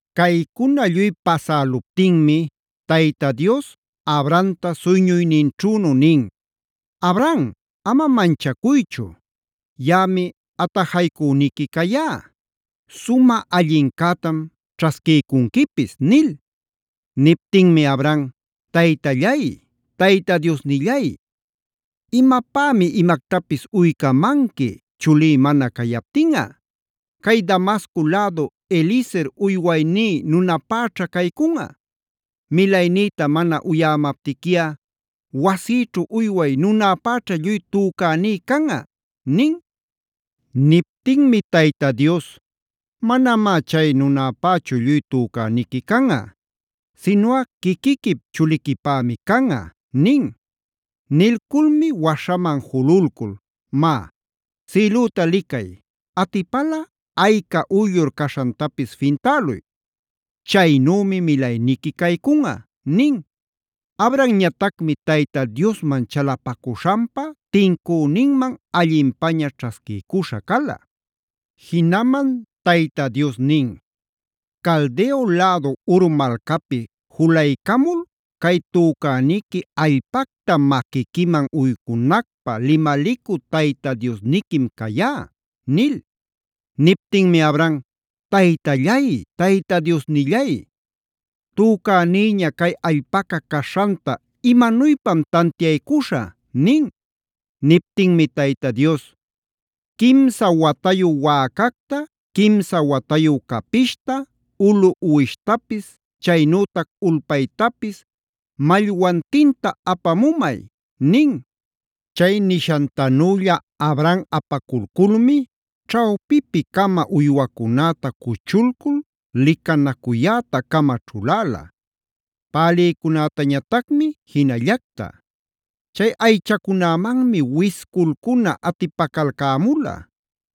Caycuna lluy pasäluptinmi Tayta Dios Abramta suyñuyninćhünu nin: “Abram ama manchacuychu; yaꞌami atajaycüniqui cayá; sumä allincätam ćhasquïcunquipis” nil. Niptinmi Abram: “Taytallay, Tayta Diosnillay, ¿imapämi imactapis uycamanqui, chulí mana cayaptinꞌa? Cay Damasco lädu Eliezer uywayní nunäpäćha caycunꞌa. “Milaynïta mana uyämaptiquiꞌa wasïćhu uyway nunäpäćha lluy tücäní canꞌa” nin. Niptinmi Tayta Dios: “Manamá chay nunapächu lluy tücäniqui canꞌa. Sinuꞌa quiquiquip chuliquipämi canꞌa” nin. Nilculmi waśhaman jululcul: “Má, sïlüta licay; atipalꞌa ayca uyllur caśhantapis fintäluy. ¡Chaynümi milayniqui caycunꞌa!” Abramñatacmi Tayta Diosman chalapacuśhanpa tincüninman allinpaña ćhasquiycuśha cala.b Jinaman Tayta Dios nin: “Caldeo lädu Ur malcapi julaycamul, cay tücäniqui allpacta maquiquiman uycunacpä limalicü Tayta Diosniquim cayá” nil. Niptinmi Abram: “Taytallay, Tayta Diosnillay ¿tücänïña cay allpaca caśhanta imanuypam tantiaycuśhä?” nin. Niptinmi Tayta Dios: “Quimsa watayu wäcacta, quimsa watayu capishta, ulu uwishtapis, chaynütac ulpaytapis, mallwantinta apamumay” nin. Chay nishantanülla Abram apalcamulmi ćhawpipi-cama uywacunäta cuchulcul licanacuyäta-cama ćhuläla;c pälïcunätañatacmi jinallacta. Chay aychacunämanmi wisculcuna atipacalcämula;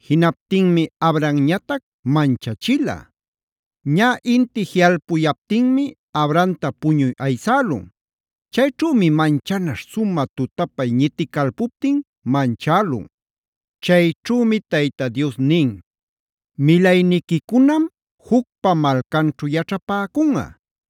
jinaptinmi Abramñatac manchachila. Ñä inti jiꞌalpuyaptinmi Abramta puñuy aysälun. Chayćhümi manchanaśh sumä tutapay ñiticalpuptin manchälun. Chayćhümi Tayta Dios nin: “Milayniquicunam jucpa malcanćhu yaćhapäcunꞌa.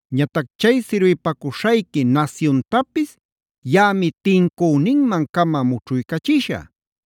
Ñatac chay sirbipacuśhayqui nasyuntapis yaꞌami tincüninman-cama mućhuycachishä.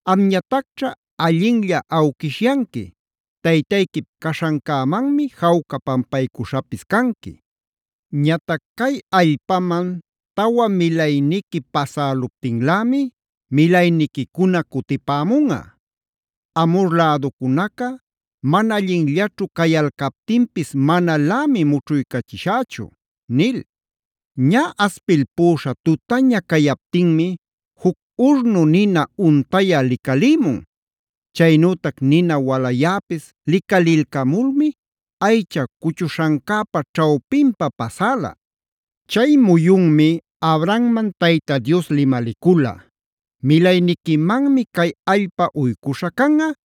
Amñatacćha allinlla awquishyanqui; taytayquip caśhancämanmi jawca pampaycuśhapis canqui. Ñatac cay allpaman tawa milayniqui pasäluptinlämi milayniquicuna cutipämunꞌa. Amhor läducunaca mana allinllaćhu cayalcaptinpis manalämi mućhuycachishächu” nil. Ñä aspilpüśha tutaña cayaptinmi juc urnu nina untayä licalïmun. Chaynütac nina walayäpis licalilcamulmi aycha cuchuśhancäpa ćhawpinpa pasäla. Chay muyunmi Abramman Tayta Dios limalicula: “Milayniquimanmi cay allpa uycuśhä canꞌa,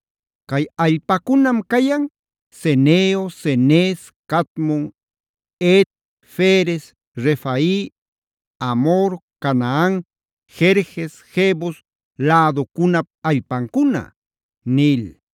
Cay allpacunam cayan: Ceneo, Cenez, Cadmon, Het, Ferez, Refai, Amhor, Canaan, Gerges, Jebus läducunap allpancuna” nil.